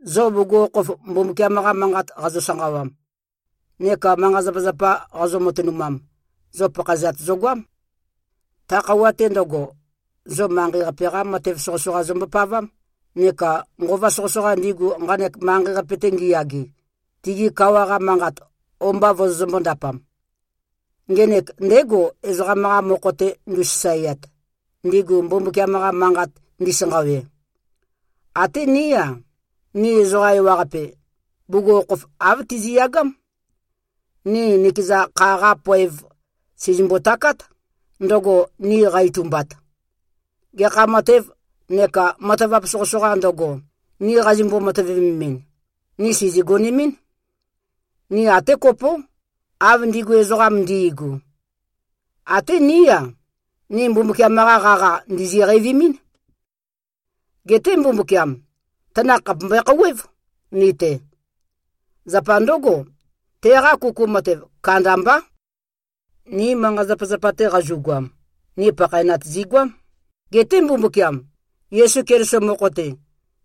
Zo bugukhokhof Mbumbukiam-qa manqat qazo-sanqawam neka manqa-zapazapa qazo-matønumam, zo pakhaezat zogoám. Ta khøuwa-te ndøgo, zo manqei-qape-qá matev soqøsoqa zombopavám, neka nqova soqøsoqa, ndigu nqanek manqei-qape-te ngiyage, tigi kawa-qa manqat o-mba vozombøē-ndapam. Ngenek ndégo, ezoqam-qa mokho-te ndu꞉sasaeat, ndigu Mbumbukiam-qa manqat ndisanqawe. Até ní-a, ni ezoqa ewaqape, bugukhokhof āv tizi꞉yagám. Ni nikeza kha-qa poev, sìzimbo-takát, ndøgo ni qa-itumbat. Gekha matev neka matavap soqøsoqā ndøgo, ni qazimbo-matøvememɨn, ni sìzigonemɨ́n. Ni até kopó, av ndigu ezoqam ndi꞉gu. Até ní-a, ni Mbumbukiam-qa qaqa ndìzi-qeivimín. Geté Mbumbukiam, tanakh khàpe mbøe-khouwév ni-te. Zapa ndǿgo, teqa kuku matev kandambá. Ni manqa-zapazapa-te qazu꞉goam, ni pakhaenat zigoám. Geté Mbumbukiam, Yesu Keliso mokho-te,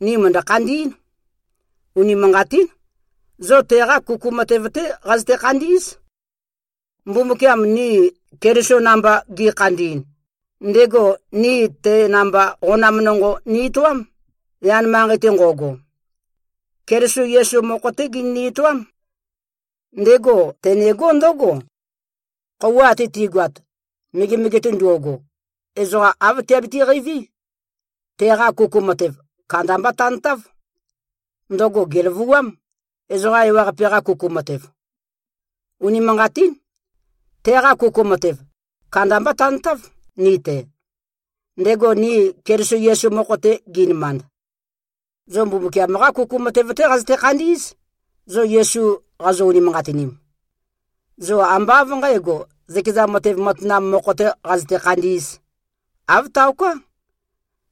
ni mø̀ndø-khandí꞉n. Unimanqatín. Zo teqa kuku matev-té qazøte-khandí꞉z. Mbumbukiam ni Keliso namba ge꞉khandi꞉n, ndego ni te namba qonam nonqo ni-etoám, yan manqei-te nqo꞉go. Keliso Yesu mokho-té genøni-etoám. Ndego tenegó ndǿgo: Khøuwa ate ti꞉goat, megemege-te ndo꞉go, ezoqa āv tiabiti-qeiví: Teqa kuku matev, kandamba tantáv. Ndøgo gèløvuám, ezoqa ewaqape-qa kuku matev. Unimanqatín. Teqa kuku matev, kandamba tantáv ni-te, ndego ni Keliso Yesu mokho-te gi꞉nømand. Zo Mbumbukiam-qá kuku matev-té qazøte-khandí꞉z, zo Yesu qazo-unimanqatinim. Zo ambá av nqǣgo, zøkeza matev matanam mokho-tē qazøte-khandī꞉z. Āv taoká.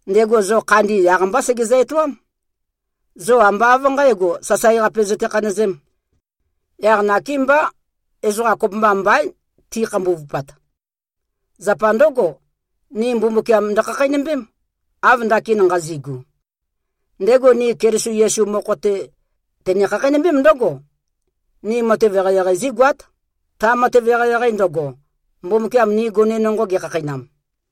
Ndego zo khandi, yaq-mbá segezø-etoám. Zo ambá av nqǣgo, sasae-qape zøte-khanøzēm. Yaq nakémbá, ezoqa kopømba mbaín, ti꞉khambuvupat. Zapa ndǿgo, ni Mbumbukiam ndøkhakheinømbém, av ndakin nqazi꞉gu. Ndego ni Keliso Yesu mokho-te, tene-khakheinømbém ndǿgo: Ni matev eqeieqei zígoát, ta matev eqeieqei ndøgo, Mbumbukiam ni gone nonqo gekhakheinam.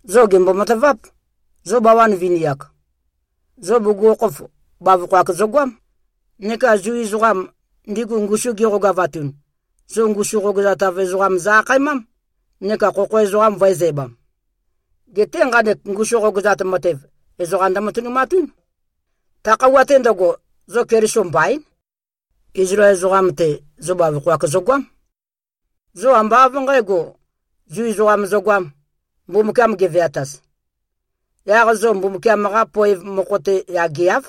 Zo gèmbo-mataváp, zo bawan vini-ak: Zo bugukhokhof, bavokho-ak zogoám. Neka Zu ezoqam, ndigu ngusum giqogavatun, zo ngusu qogøzatav ezoqam zø-akhaemám, neka khokho ezoqam vø̄ezæbam. (Geté nqanek ngusu qogøzat matev, ezoqa ndømatønumatún.) Ta khøuwa-te ndøgo, zo Keliso mbaín. Izlael ezoqam-te, zo bavokho-ak zogoám. Zo ambá av nqægo, Zu ezoqam zogoám, Mbumbukiam geveataz. Yaq zo Mbumbukiam-qa poev mokho-te yageáv,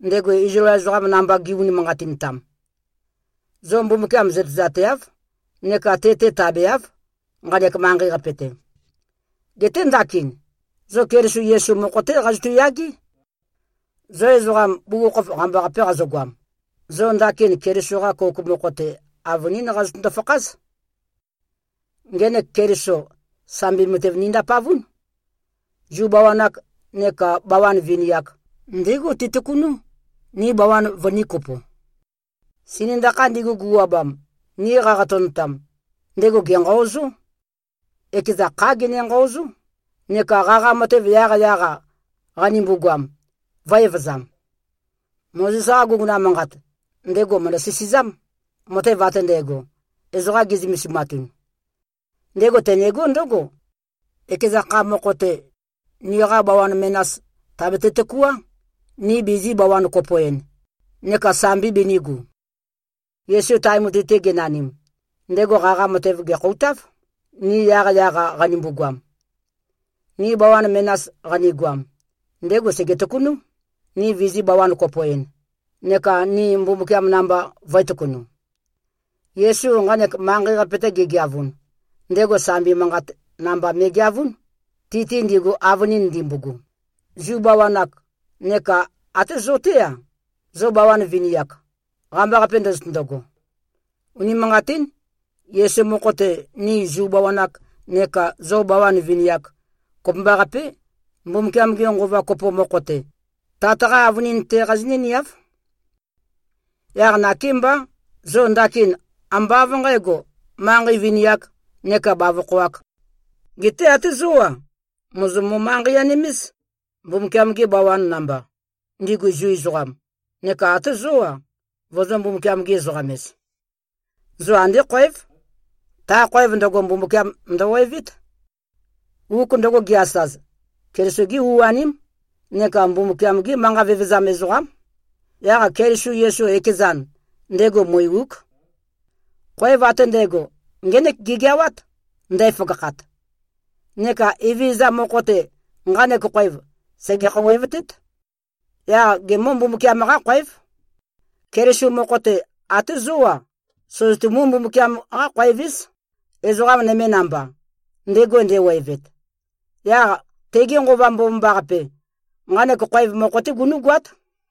ndego Izlael namba gi꞉-unimanqatintam. Zo Mbumbukiam zøtezateáv neka te-te tabeáv, nqanek manqei-qape-te. Geté ndakin, zo Keliso Yesu mokho-té qazotu꞉-yagé. Zo ezoqam, bugukhokhof qambaqape qazogoam, zo ndakin Keliso-qa kouk mokho-te, avønín qazøtøndo-fakház. Ngenek Keliso, sambi matev nindapavún. Zu bawan-ak neka bawan vini-ak, ndégo tetøkunú, ni bawan vønīkopo. Sinøndakha ndigu, gu꞉wabam, ni qaqatønotam, ndego gènqaozó. Ekeza khá gene-nqaozó, neka qaqa matev, yaqyaq-a qanimbu-goam, vø̄-evøzam. Mozes-qa guguna manqat, ndego mø̀ndø-sisizám, matev ate ndægo, ezoqa gi꞉zømesimatun. Ndego tenegó ndǿgo: Ekeza kha mokho-te, niqa bawan menas tàbete-tøkuá, ni bizī-bawan-kopo-en, neka sambi binīgu. Yesu tae mutui-te genanim, ndego qaqa matev gèkhoutáv, ni yaqyaq-a qanimbu-goam. Ni bawan menas qanigoam, ndego sège-tøkunú, ni vizī-bawan-kopo-en, neka ni Mbumbukiam namba vø̄e-tøkunu. Yesu nqanek manqei-qape-te gegeavun, ndego sambi manqat namba me꞉geavún, ti-te ndigu, avønin ndimbogo, Zu bawan-ak, neka até zo-té-a, zo bawan vini-ak, qambaqape ndozotøndogo. Unimanqatín. Yesu mokho-te, ni Zu bawan-ak nekā zo bawan vini-ak, kopømbaqapé, Mbumbukiam-ge Nqova kopo mokho-te, Tat-qá avønin-té qazinǿ-niáv. Yaq nakémbá, zo ndakin ambá av nqǣgo, manqei vini-ak neka bavokho-āk. Geté até zó-a, mòzo-mo-manqei-anim-éz, Mbumbukiam-gi bawan namba, ndigu Zu ezoqam, neka até zó-a, vozō-Mbumbukiam-gi-ezoqam-ez. Zo andé khoév. Ta khoev ndøgo, Mbumbukiam ndøwevét. Uk ndøgo ge-asaz, Keliso-gí u-aním neka Mbumbukiam-gí manqa vevezam ezoqám. Yaq Keliso Yesu ekezan, ndego mui-úk. Khoev ate ndægo, ngének gegeawát, ndæføgakhat. Neka Evezøza mokho-te, nqanek khoev sège-khouwevtét. Yaq gemǿ-Mbumbukiam-qá-khoév. Keliso mokho-te, até zó-a, søzøtumú-Mbumbukiam-qá-khoev-éz, ezoqa nøme namba, ndego ndewevet. Yaq tege Nqova Mbomambaqape, nqanek khoev mokho-té gunú꞉goát.